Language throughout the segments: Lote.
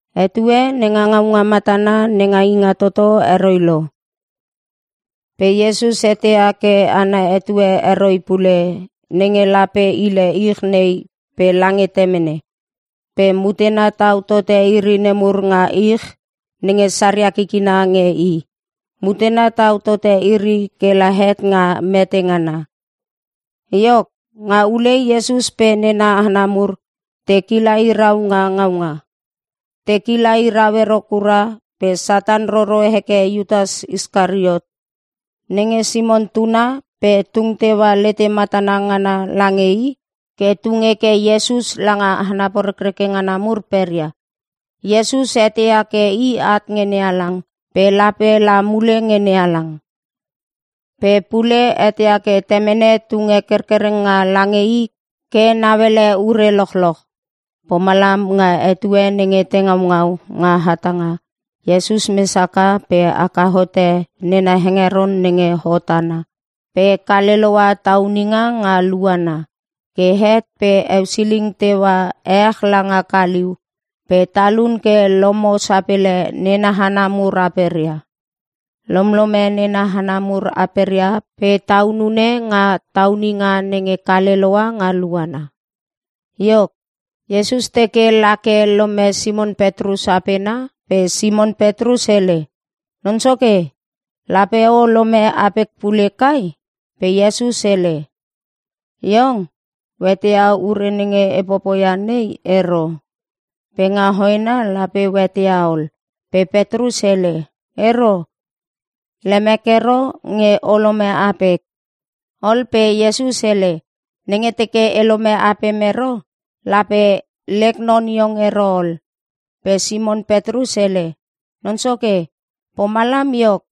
Etue nenga ngaunga matana nenga Ingatoto heroi lo. Pe Iesus eteia ke ana etue heroi pule, nenge lape hile ich nei pe lange Temene. Pe mutena tau tote iri nemur nga ich nenge saria kikina nge i. Mutena tau tote iri kela het nga mete ngana. Iok, nga ulei Iesus pe nena hana mur te kila hirau nga ngaunga. Te kila hirau ero kura pe Satan roro heke Iutas Iskariot nenge Simon tuna pe tung teua lete matana ngana lange i ke tung heke Iesus langa hana porekreke ngana mur peria. Iesus eteia ke i at nge NeHalang pe lape la mule nge NeHalang. Pe pule eteia ke Temene tunge kerkerenga lange i ke nauele ure lochloch. Pomalam nga etue nenge te ngaungau nga hatanga, Iesus mes haka pe haka hote nena hengeron nenge hot ana pe kale loua tauninga nga luana. Ke het pe eusiling teua ech langa kaliu pe talun ke lomo sapele nena hana mur aperia. Lomlome nena hana mur aperia pe taunune nga tauninga nenge kale loua nga luana. Iok, Iesus teke lake lome Simon Petrus apena pe Simon Petrus hele, “Non Soke, lape o lome apek pule kai?” Pe Iesus hele, “Iong, o eteia ure nenge e popoia nei ero, pe nga hoena lape o eteia ol.” Pe Petrus hele, “Ero! Lemek ero nge o lome apek.” Ol pe Iesus hele, “Nenge teke elome apem ero, lape lek non iong ero ol.” Pe Simon Petrus hele, “Non Soke pomalam iok,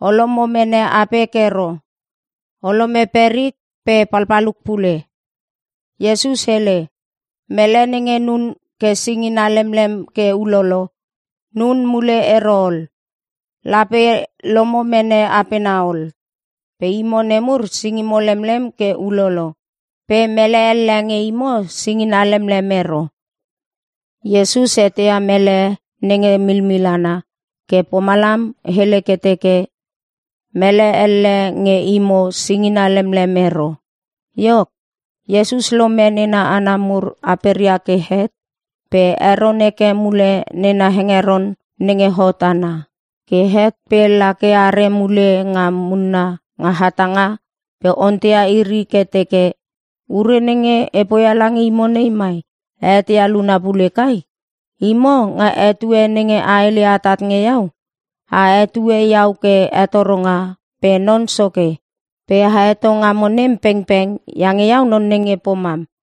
o lomo mene apek ero. O lome perik pe palpaluk pule.” Iesus hele, “Mele nenge nun ke singina lemlem ke ulolo, nun mule ero ol. Lape lomo mene apena ol. Pe imo nemur singimo lemlem ke ulolo pe mele elle nge imo singina lemlem ero.” Iesus eteia mele nenge milmil ana ke pomalam hele ke teke, “Mele elle nge imo singina lemlem ero.” Iok, Iesus lome nena hana mur aperia ke het pe heron heke mule nena hengeron nenge hot ana. Ke het pe la ke are mule nga munna nga hatanga pe onteia iri ke teke, “Ure nenge e poia lange imo nei mai a eteia luna pule kai? Imo, nga etue nenge a hele atat nge iau, a hetue iau ke Hetoronga pe Non Soke. Pe a heto ngamo nem pengpeng iange iau non nenge pomam.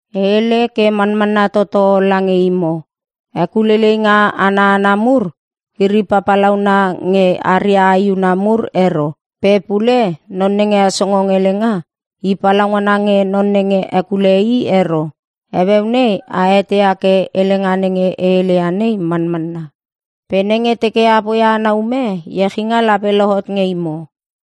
E hele ke manmanna toto lange imo, hekuleileinga ana hana mur iri papalauna nge aria aehuna mur ero. Pe pule non nenge hesongong helenga, i palaungana nge non nenge hekule i ero. Heueu nei a eteia ke helenga nenge e heleia nei manmanna. Pe nenge teke a poia ana ume, iechinga lape lohot nge imo.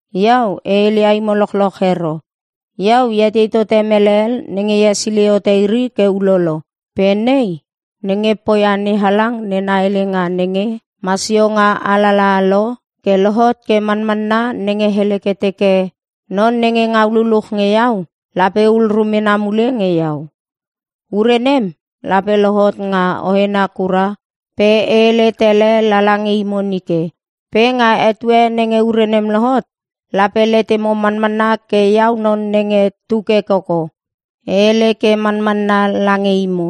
“Iau e heleia imo lochloch ero, iau e etei tote mele hel nenge e hesilei hote iri ke ulolo. Pe nei nenge poia NeHalang nena helenga nenge masio nga alalaha lo, ke lohot ke manmanna nenge hele ke teke, ‘Non nenge ngau luluch nge iau lape hul rumena mule nge iau.’ “Ure nem, lape lohot nga hoena kura pe e hele tele lala nge imo nike. Pe nga etue nenge ure nem lohot, lape letemo manmanna ke iau non nenge tu ke koko. E hele ke manmanna lange imo,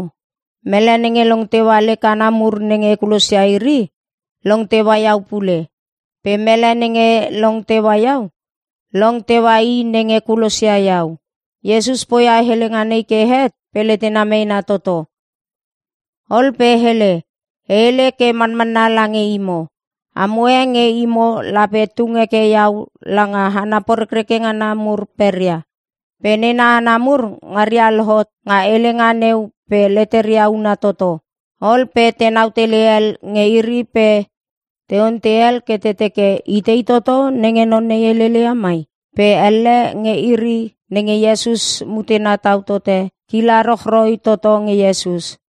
mele nenge long teua lek hana mur nenge e kulosia iri, long teua iau pule. Pe mele nenge long teua iau, long teua i nenge kulosia iau.” Iesus poia helenga nei ke het pe letena meena toto. Ol pe hele, “E hele ke manmanna lange imo. Amo e nge imo lape tung heke iau langa hana porekreke ngana mur peria.” Pe nena hana mur ngaria lohot nga helenga neu pe leteria una toto. Ol pe tenau tele hel nge iri pe te ontei hel ke te teke, “Itei toto nenge non nei helele ia mai?” Pe elle nge iri nenge Iesus mutena tau tote, kila rochroi toto nge Iesus.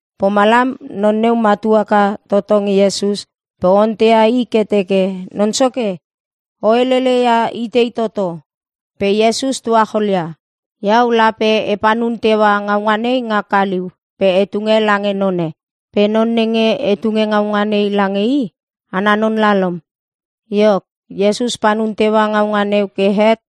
Pomalam non neu matu haka toto nge Iesus pe onteia i ke teke, “Non Soke o helele ia itei toto?” Pe Iesus tuacholia, “Iau lape e panun teua ngaunga nei nga kaliu pe e tunge lange none. Pe non nenge e tunge ngaunga nei lange i, ana non lalom.” Iok, Iesus panun teua ngaunga neu ke het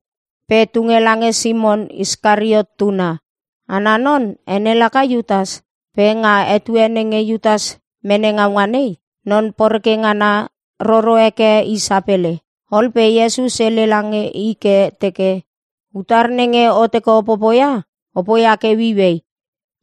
pe tunge lange Simon Iskariot tuna. Ana non ene laka Iutas. Pe nga etue nenge Iutas mene ngaunga nei, non poreke ngana roro heke i sapele. Ol pe Iesus hele lange i ke teke, “Utar nenge o teke o popoia, o poia ke ueiuei.”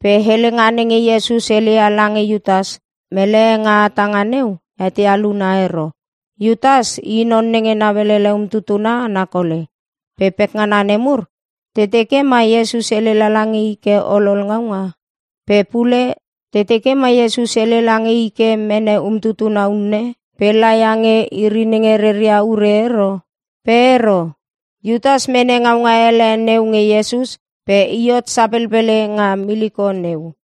Pe helenga nenge Iesus heleia lange Iutas, mele e nga hatanga neu eteia luna ero. Iutas i non nenge nauelele umtutuna ana kole. Pe pekngana nemur te teke ma Iesus hele lala nge i ke olol ngaunga. Pe pule te teke ma Iesus hele lange i ke mene umtutuna unne pe laia nge iri nenge reria ure ero. Pe ero. Iutas mene ngaunga ele neu nge Iesus pe i hot sapelpele nga miliko neu.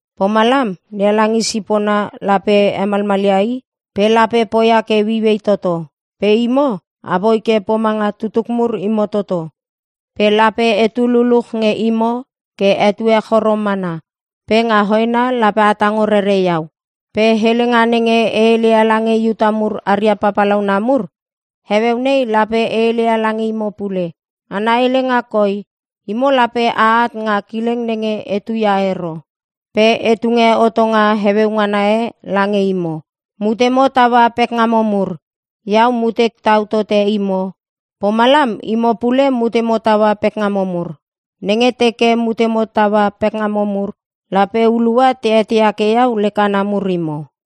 Pomalam NeHalang i sipona lape hemalmalia i pe lape poia ke ueiuei toto. “Pe imo, apoi ke pomanga tutuk mur imo toto. Pe lape etu luluch nge imo ke etue choro mana pe nga hoena lape a tango rere iau. Pe helenga nenge e hele ia lange Iuta mur aria papalauna mur, heueu nei lape e hele ia lange imo pule. Ana helenga koi, ‘Imo lape a at nga kileng nenge etu ia ero.’ “Pe e tunge hotonga heueu ngana e lange imo: Mutemo taua pekngamo mur. Iau, mutek tau tote imo pomalam imo pule mutemo taua pekngamo mur. Nenge teke mutemo taua pekngamo mur, lape hulua te eteia ke iau lek hana mur imo.”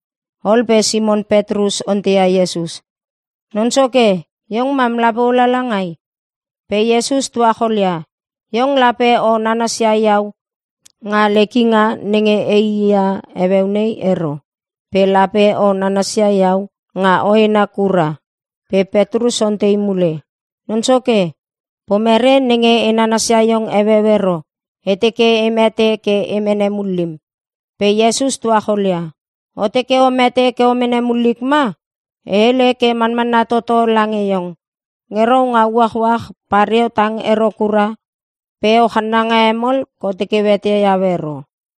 Ol pe Simon Petrus onteia Iesus, “Non Soke, iong mam lape o lala langai?” Pe Iesus tuacholia, “Iong lape o nanasia iau nga lek inga nenge eii ia heueu nei ero. Pe lape o nanasia iau nga hoena kura.” Pe Petrus ontei mule, “Non Soke, pomerei nenge e nanasia iong heueu ero? E teke e mete ke e mene mullim.” Pe Iesus tuacholia, “O teke o mete ke o mene mullik ma? E hele ke manmanna toto lange iong. Nge rou nga uachuach pareo tang ero kura pe o channanga hemol ke o teke o eteia iau ero.”